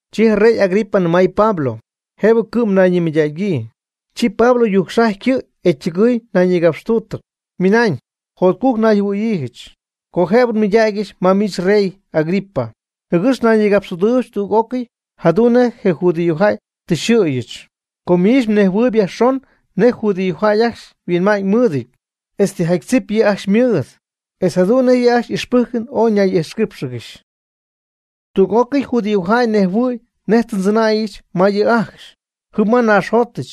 Chi je rey Agripa nɨmay Pablo: ―Jëbɨ cɨ'm mnayñimɨydägyii. Chi Pablo yujcxajy ycɨ' e ytɨgɨɨy nayñïgapxtuutɨp, ymɨnañ: ―Jotcujc nayjɨhuɨ̈yiijɨch, co jëbɨ nmɨydägyɨch ma miich, rey Agripa, jɨgɨx nayñïgapxtüdɨɨybɨch tüg'ócɨy jadu'n nej judío jäy tɨ xyxɨ̈yɨch. Com miich mnejhuɨɨyb yajxon nej judíojäy ajcxy yhuinma'ñ mɨɨdɨty, etz tijaty tzip yɨ' ajcxy ymɨɨd, etz jadu'n nej yɨ' ajcxy y'ixpɨ́jcɨn oy ñay'ijxquíipxɨgɨxy. Tüg'ócɨy judíojäy ñejhuɨɨyb nej tɨ ndzɨnäyɨch ma yɨ' ajcxy jɨm ma nnaaxjotɨch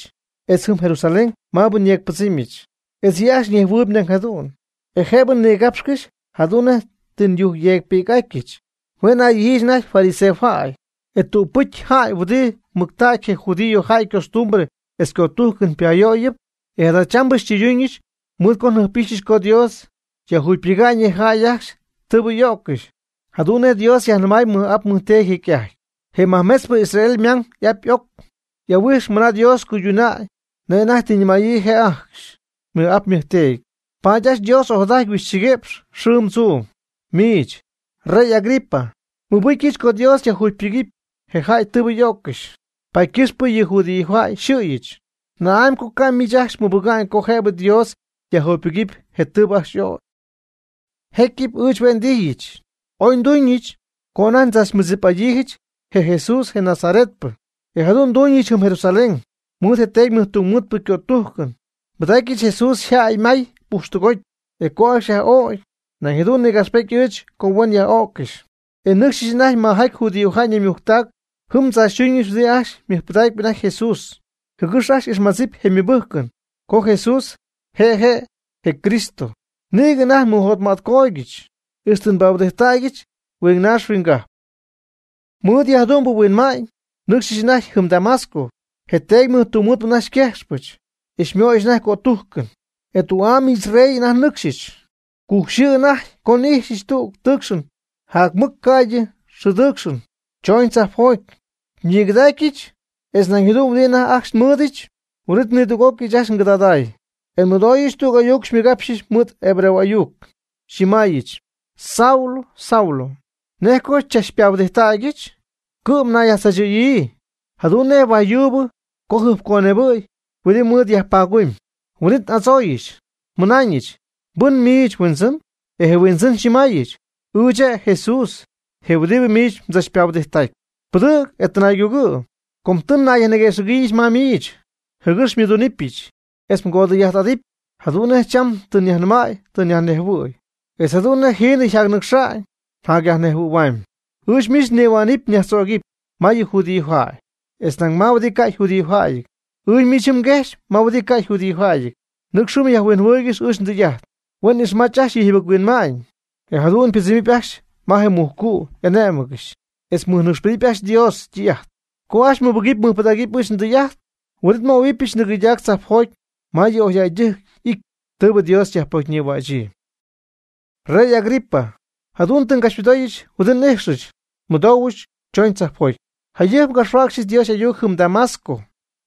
etz jɨm Jerusalén maabɨ nyeecpɨdzɨmyɨch. E yɨ' ajcxy ñejhuɨɨyb nañ jadu'n, e jëbɨ nigapxcɨxy jadu'n nej tɨ nyujcyeecpɨ'atyɨch. Hue' naydijyiijɨch anajty fariseojäy, je tügpɨcpyɨ jäy huɨdi mɨctägy je judío jäy ycostumbre etz ycötújcɨn payöyɨp. E jadachambɨ xytɨyduñɨch mɨɨd co njɨjp'ixyɨch co Dios yajjugypɨga'ñ yɨ jäy ajcxy tɨɨbɨ y'o'ccɨxy, jadu'n nej Dios yajnɨmay nmɨj'ap nmɨjteedy jecy'ajty. Je majmetzpɨcypɨ Israel ymang y'ap y'oc y'ahuijxpy mɨna Dios cuyduna'ñ nej anajty tɨ yajnɨmäyii je' ajcxy ymɨj'ap ymɨjteedy. Paady ajcxy Dios ojadaty huindzɨgɨ̈y xɨɨm tzuum. Miich, rey Agripa, nmɨbɨcyɨch co Dios yajjugypɨgɨpy je jäy tɨɨbɨ y'öccɨxy, paady ycɨxpɨ yɨ judíojäy yxɨ̈yɨch. ¿Na'amy co ca' miich ajcxy mɨbɨga'ñ co jëbɨ Dios yajjugypɨcy je tɨɨbɨ ajcxy y'ögy? Jecyɨp ɨɨch hue' ndijyɨch oy nduñɨch co anajty ndzachmɨdzip'adyiijɨch je Jesús je Nazaretpɨ. E jadu'n nduñɨch jɨm Jerusalén. Mɨɨd je teedy mɨjtungmɨɨdpɨ ycötújcɨn nbɨdaacɨch Jesús yjäy may pujxtɨgoty. E co ajcxy yaj'o'cy, nañ nïgapxpejt ɨɨch co huen yaj'öccɨxy. E nnɨcxyɨch anajty majaty judío ñaymujctac jɨm ndzaachytuñɨch huɨdi ajcxy mɨjpɨdacp anajty Jesús, jɨgɨx ajcxy y'ixmadzɨpy je' ymɨbɨ́jcɨn co Jesús je' je' je Cristo. Nïgɨ anajty nmɨjotmätcootyɨch ixtɨ nbahuɨdijttacyɨch huingnaax huinggajp. Mɨɨd yɨ jadu'mbɨ huinma'ñ nnɨcxyɨch anajty jɨm Damasco. Je teedy mɨjtungmɨɨdpɨ anajty xyquejxpɨch, e xymöyɨch anajty cötújcɨn. E tü'am, señor rey, ɨɨch anajty nɨcxy, cujc xɨɨ anajty co n'ijxyɨch tügɨ tɨɨcxɨn jacmɨc ca'ydɨ xɨɨ ytɨɨcxɨn chooñ tzajpjoty, xyñigɨdacyɨch etz nañ jadu'n huɨdi anajty ajcxy xymɨɨdnɨcxɨch. Huin'it nidüg'ócɨy ɨɨch ajcxy ngɨdaday, e nmɨdooyɨch tüg ayuc xymɨgapxɨch mɨɨd hebreo y'ayuc, xyñɨmäyɨch: “Saulo, Saulo, ¿nej co chach xypahuɨdijttägyɨch? Cɨ'm nayyajtzaachɨ̈yii jadu'n nej huaj yuub co jɨjpconebɨ̈y huɨdi mɨɨd ñumygumyii.” Huin'it n'adzooyɨch, nnɨmaayɨch: “¿Mbɨn miich Huindzɨn?” E je Huindzɨn xyñɨmaayɨch: “Ɨɨch je' Jesús je huɨdi miich mdzachpahuɨdijttacpy. Pɨdɨ̈g e tɨnaaygugɨ', com tɨ nnayguëxɨ̈gyiijɨch ma miich jɨgɨx xymɨdunɨpyɨch etz mgodɨy'ajt'adɨpy jadu'n nej cham tɨ nyajnɨmäy tɨ nyajnejhuɨ̈y, etz jadu'n nej jiinɨ njacyaj'ixa'ñ njacyajnejhuɨ̈hua'ñ. Ɨɨch miich nnihuänɨp nyajtzögɨp ma yɨ judíojäy, etz nañ ma huɨdi ca' yjudíojäyɨty. Ɨɨch miich jɨm nguejxpy ma huɨdi ca' yjudíojäyɨty. Nɨcx jɨm myajhuinjɨhuɨɨygɨxy ɨɨch ndɨy'ajt, huen ixmach ajcxy yɨ jɨbɨc-huinma'ñ e jadu'n ypɨdzɨmɨpy ajcxy ma je mujcu' y'ané'mɨgɨxy, etz mɨjnɨcxpedɨpy ajcxy Dios ytɨy'ajt. Co ajcxy mɨbɨgɨpy mɨjpɨdägɨpy ɨɨch ndɨy'ajt huin'it nmöhuɨbɨch tɨgɨydac tzajpjoty ma yɨ oyjäydɨjc ity tɨɨbɨ Dios yajpocyñïhuächyii.” Rey Agripa, jadu'n tɨ ngapxymɨdooyɨch huɨdi n'ijxɨch nmɨdoohuɨch tzoon tzajpjoty. Jayɨjp ngapxhuäcxɨch Dios y'ayuc jɨm Damasco,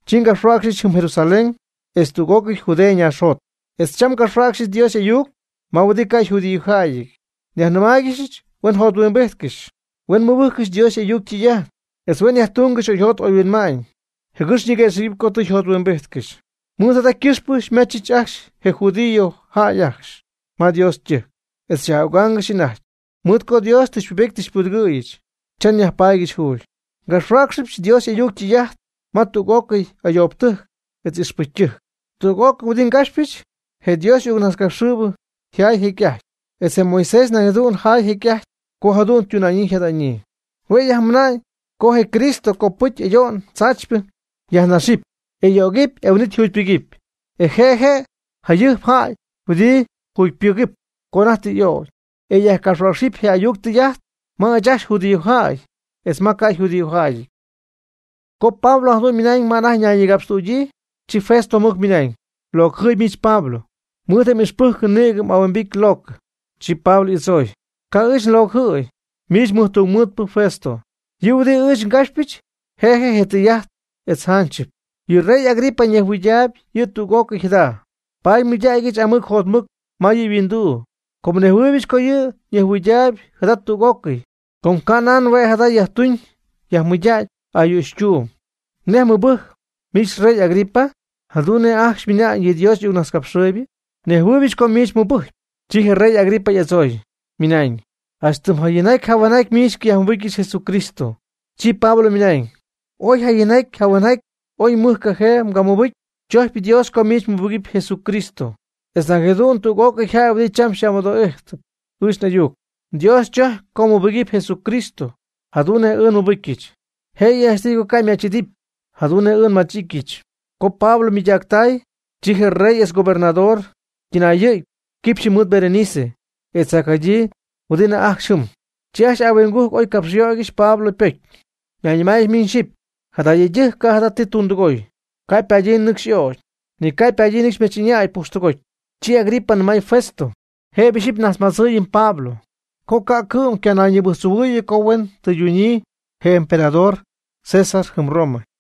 chi ngapxhuäcxɨch jɨm Jerusalén etz tüg'ócɨy Judea ñaaxjot, etz cham ngapxhuäcxɨch Dios y'ayuc ma huɨdi ca' yjudíojäyɨty. Nyajnɨmáaygɨxyɨch huen jothuimbijtcɨxy, huen mɨbɨjccɨxy Dios y'ayuc ytɨy'ajt, etz huen yajtungɨxy oyjot oyhuinma'ñ jɨgɨx ñiguëxɨ̈gɨpy co tɨ yjothuimbijtcɨxy. Mɨɨd jada ycɨxpɨ xymajchɨch ajcxy je judíojäy ajcxy ma Dios ytɨjc, e xyaj'ögáangɨxyɨch anajty. Mɨɨd co Dios tɨ xypubety tɨ xypudɨgɨ̈yɨch cha nyajpaadyɨch juugy. Ngapxhuäcxyɨch Dios y'ayuc ytɨy'ajt ma tüg'ócɨy ayoobtɨjc etz ixpɨcytɨjc. Tüg'ócɨy huɨdi ngapxpyɨch je Dios y'ayucnajtzcapxɨɨybɨ jaay jecy'ajty, etz je Moisés nañ jadu'n jaay jecy'ajty co jadu'n ytuna'ñyii yjada'ñyii. Hue' yajmɨna'ñ co je Cristo copɨcy ayo'n tzaachypɨ yajnaxɨpy, e y'ögɨpy e huin'it jugypɨgɨpy, e je' je' je jayɨjp jäy huɨdi jugypɨgɨp co anajty tɨ y'ögy. E yajcapxhuäcxɨp je ayuc ytɨy'ajt ma ɨɨch ajcxy judíojäy, etz ma huɨdi ca' yjudíojäyɨty. Co Pablo jadu'n ymɨnañ ma anajty ñayñïgapxtüdyii, chi Festo mɨc mɨnañ: ―¡Mlocjɨɨyb miich Pablo! Mɨɨd je ixpɨ́jcɨn nïgɨ m'ahuimbity locɨ. Chi Pablo y'adzooy: ―Ca' ɨɨch nlocɨjɨ̈y, miich mɨjtungmɨɨdpɨ Festo. Yɨ huɨdi ɨɨch ngapxpyɨch je' je' tɨy'ajtɨp etz janchɨp. Yɨ rey Agripa ñejhuɨydaayb yɨ' tüg'ócɨy jada, paady nmɨydägɨch aamɨc jotmɨc ma yɨ' yhuinduu; com nnejhuɨɨybɨch co yɨ' ñejhuɨydaayb jada tüg'ócɨy, com canan hue' jada yajtuuñ yajmɨydacy ayüchytuum. ¿Nej mmɨbɨjcpy, miich rey Agripa, jadu'n nej ajcxy ymɨnañ yɨ Dios y'ayuccojaaybɨ? Nnejhuɨɨybɨch co miich mmɨbɨcy. Chi je rey Agripa y'adzooy, ymɨnañ: ―Janch tɨm jayinjaty jahuenjaty miich xycayajmɨbɨcyɨch Jesucristo. Chi Pablo ymɨnañ: ―Oy yjayinjaty yjahuenjatyɨty ooy mɨjcajee mgamɨbɨcy, chojcpy Dios co miich mmɨbɨgɨpy Jesucristo etz nañ jadu'n tüg'ócɨy jäy huɨdi cham xy'amɨdoo'íjtɨp ɨɨch n'ayuc. Dios chojcpy co mmɨbɨgɨpy Jesucristo jadu'n nej ɨɨch nmɨbɨcyɨch, jëyɨ janchtɨy co ca' mmach'idɨpy jadu'n nej ɨɨch nmach'ityɨch. Co je Pablo ymɨydactay, chi je rey etz gobernador ytɨnayɨ̈gy quipxyɨ mɨɨd Berenice etz jacjadyii huɨdi anajty ajcxy jɨm. Chi ajcxy ahuingujc oy capxyöygɨxy Pablo ypocy, ñayñɨmáayɨgɨxy miñ xyɨpy: ―Jada yëydɨjc ca' jada ti tundɨgoy, ca' ypadyii nɨcxy y'ögy, ni ca' ypadyii nɨcxy ymach'ɨñäy pujxtɨgoty. Chi Agripa nɨmay Festo: ―Jëbɨ ixyipy nnajtzmadzɨɨyɨm Pablo co ca' cɨ'm ycanayñibɨjctzohuɨɨyɨ co huen tɨydunyii je emperador César jɨm Roma.